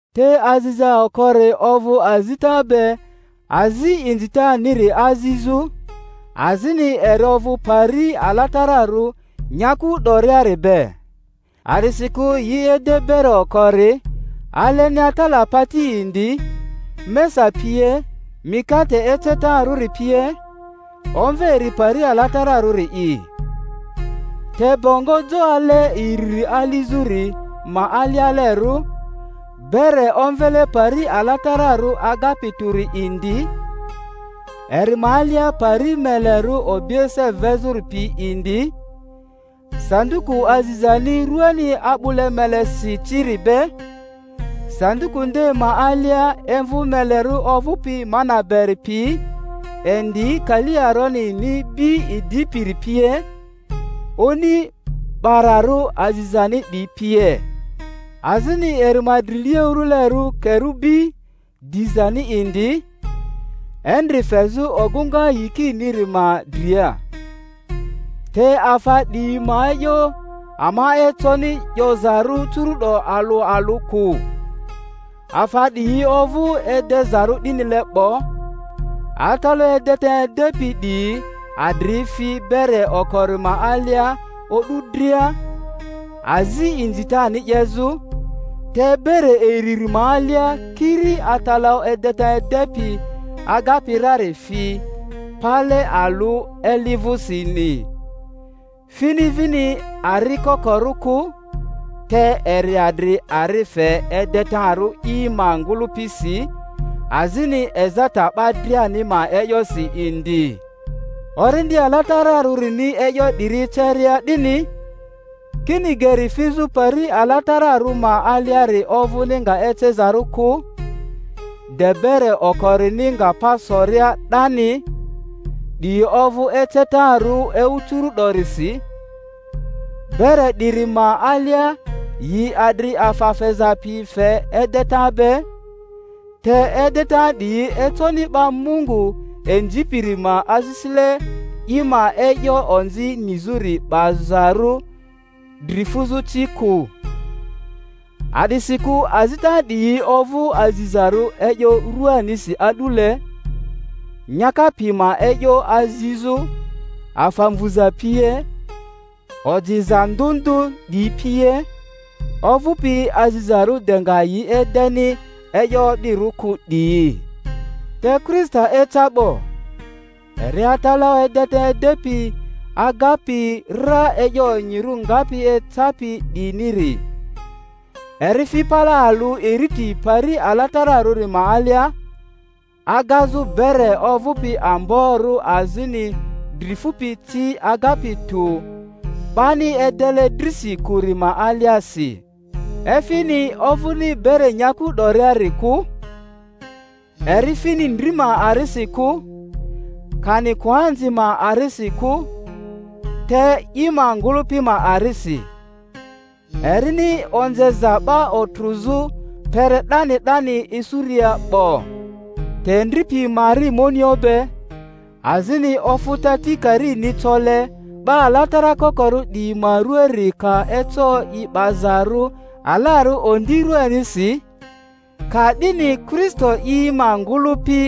Te aziza okori ovᴜ azita be azi inzitaniri azizᴜ, azini eri ovᴜ pari alatararᴜ nyaku 'doriari be. A’disikᴜ yi ede bere okori, alenia tala pati indi, mesa pie, mikate ecetarᴜri pie; omve eri Pari Alatararᴜri'i. Te bongo jo ale iriri alizᴜri ma alialerᴜ, bere omvele Pari Alatararᴜ Agapi Tᴜri indi; eri ma alia pari melerᴜ obiese vezᴜri pi indi, sanduku azizani ruani a'bᴜle melesi ciri be, sanduku nde ma alia imvᴜ melerᴜ ovᴜpi mana beri pi indi kali Aronini bi idipiri pie, oni 'bararᴜ azizani 'diyi pie; azini eri ma drilia urᴜlerᴜ kerubi dizani indi, endri fezᴜ ogᴜŋa yikiniri ma dria. Te afa 'diyi ma e'yo ama econi 'yozarᴜ curu'do alᴜ alᴜ kᴜ. Afa 'diyi ovᴜ edezarᴜ 'dinile 'bo, atalaᴜ edeta edepi 'diyi adri fi bere okori ma alia o'du dria, azi inzitani 'yezᴜ; te bere iriri ma alia kiri atalaᴜ edeta edepi agapi rari fi, pale alᴜ eli vᴜsini, fini vini ari kokorᴜ kᴜ, te eri adri ari fe edetarᴜ i ma ngᴜlᴜpisi azini ezata 'ba driani ma e'yosi indi. Orindi Alatara-rᴜrini e'yo 'diri eceria 'dini, kini geri fizᴜ pari alatararᴜ ma aliari ovᴜni nga ecezarᴜ kᴜ, de bere okorini nga pa soria 'dani ('di ovᴜ ecetarᴜ ewu curu'dorisi). Bere 'diri ma alia yi adri afa feza piyi fe edeta be, te edeta 'diyi econi 'ba Mungu inzipiri ma asisile i ma e'yo onzi nizᴜri 'baza-rᴜ dri fuzᴜ ci kᴜ, a'disikᴜ azita 'diyi ovᴜ azizarᴜ e'yo ruanisi a'dule, nyaka pi ma e'yo azizᴜ, afa mvuza pie, ojiza ndᴜ ndᴜ 'diyi pie, ovᴜpi azizarᴜ de nga yi edeni e'yo o'dirᴜ kᴜ 'diyi. Te Kristo eca 'bo, eri atalaᴜ edeta edepi agapi ra e'yo onyirᴜ ngapi ecapi 'diyiniri, eri fi pale alᴜ iriti Pari Alatararᴜri ma alia, agazᴜ bere ovᴜpi amborᴜ azini dri fupi ci agapi tᴜ, 'bani edele drisi kᴜri ma aliasi (efini, ovᴜni bere nyaku 'doriari kᴜ) eri fini ndri ma arisi kᴜ, kani koanzi ma arisi kᴜ, te i ma ngᴜlᴜpi ma arisi, erini onzeza 'ba otrᴜzᴜ kpere 'dani 'dani isuria 'bo. Te ndri pi ma ari monio be, azini ofᴜta tikarini cole 'ba alatara kokorᴜ di yi ma ruaari ka eco yi 'bazarᴜ alarᴜ ondi ruanisi, ka'dini Kri-sto i ma ngᴜlᴜpi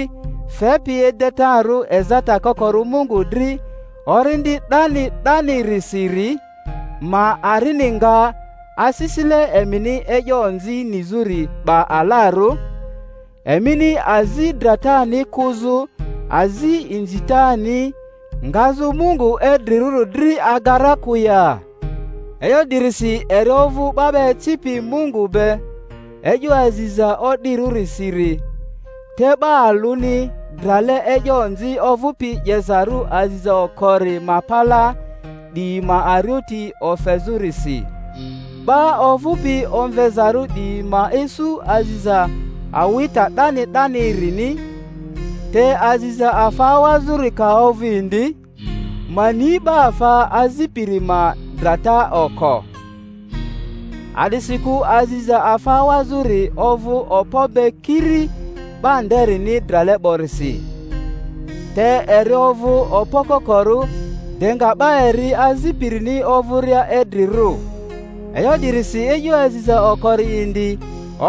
fepi edetarᴜ ezata kokorᴜ Mungu dri Orindi 'dani 'danirisiri ma arini nga asisile emini e'yo onzi nizᴜri 'ba alarᴜ, emini azi dratani kᴜzᴜ azi inzitani ngazᴜ Mungu idrirᴜri dri aga ra kᴜ ya? E'yo 'dirisi eri ovᴜ 'ba 'ba ecipi Mungu be e'yo aziza o'dirᴜri-siri, te 'ba alᴜni drale e'yo onzi ovᴜpi 'yezarᴜ aziza okori ma palaa 'diyi ma arioti ofezᴜrisi, 'ba ovᴜpi omvezarᴜ 'diyi ma isu aziza awita 'dani 'dani-rini. Te aziza afa awazᴜri ka ovᴜ indi, ma ni 'ba afa azipiri ma drata oko. A'disikᴜ aziza afa awazᴜri ovᴜ okpo be kiri 'ba nderini drale 'borisi, te eri ovᴜ okpo kokorᴜ de nga 'ba eri azipirini ovᴜria idrirᴜ. E'yo 'dirisi e'yo aziza okori indi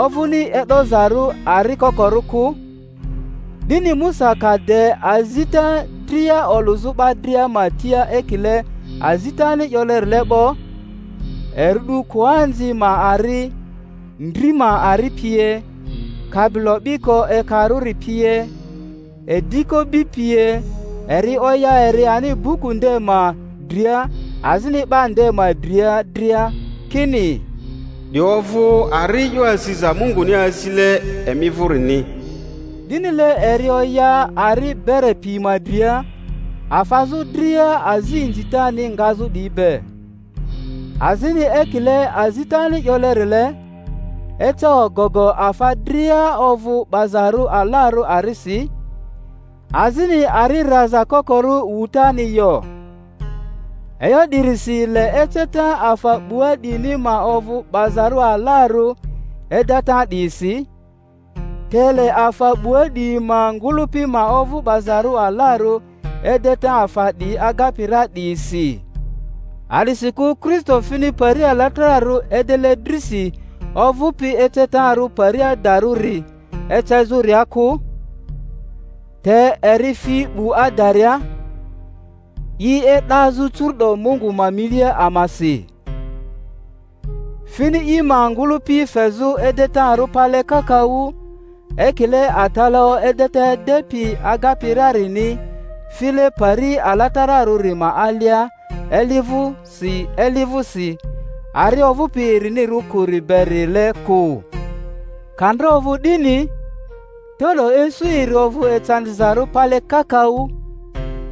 ovᴜni e'dozarᴜ ari kokorᴜ kᴜ. 'Dini Musa ka de azita dria olᴜzᴜ 'ba dria ma tia ekile azitani 'yolerile 'bo, eri 'du koanzi ma ari, ndri ma ari pie, kabilo 'biko ekarᴜri pie, ediko bi pie, eri oya eri ani buku nde ma dria azini 'ba nde ma dria dria, kini, 'Di ovᴜ ari e'yo aziza Munguni azile emi vᴜrini. 'Dinile eri oya ari bere pi ma dria, afazᴜ dria azi inzitani ngazᴜ 'diyi be. Azini ekile azitani 'yolerile, eca ogogo afa dria ovᴜ 'bazarᴜ alarᴜ arisi, azini ari raza kokorᴜ wutani yo. E'yo 'dirisi le eceta afa 'bua 'diyini ma ovᴜ 'bazarᴜ alarᴜ edeta 'diyisi, te le afa 'bua 'diyi ma ngᴜlᴜpi ma ovᴜ 'bazarᴜ alarᴜ edeta afa 'diyi agapi ra 'diyisi. A'disikᴜ Kristo fini pari alatararᴜ edele drisi ovᴜpi ecetarᴜ pari adarᴜri ecezᴜria kᴜ, te eri fi 'bu adaria, i e'dazᴜ curu'do Mungu ma milia amasi. Fini i ma ngᴜlᴜpi fezᴜ edetarᴜ pale kakaᴜ, ekile atalaᴜ edeta edepi agapi rarini file Pari Alatararᴜri ma alia eli vᴜsi eli vᴜsi, ari ovᴜpi erinirᴜ kᴜri berile kᴜ; ka ndra ovᴜ 'dini, te'do isu eri ovᴜ ecandizarᴜ pale kakaᴜ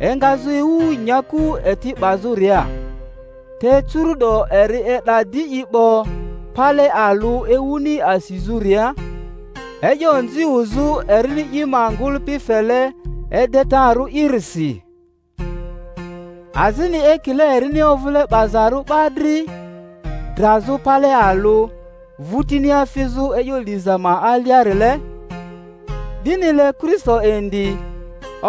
engazᴜ ewu nyaku eti 'bazᴜria. Te curu'do eri e'da di i 'bo pale alᴜ ewuni asizᴜria, e'yo onzi wuzᴜ erini i ma ngᴜlᴜpi fele edetarᴜ'irisi. Azini ekile erini ovᴜle 'bazarᴜ 'ba dri drazᴜ pale alᴜ, vᴜtinia fizᴜ e'yo liza ma aliarile, 'dinile Kristo indi,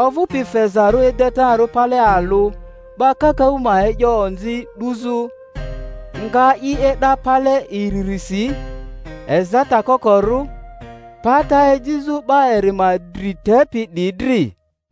ovᴜ-pi fezarᴜ edetarᴜ pale alᴜ 'ba kakaᴜ ma e'yo onzi 'duzᴜ, nga i e'da pale iririsi, ezata kokorᴜ, pata ejizᴜ 'ba eri ma dri tepi 'diyi dri.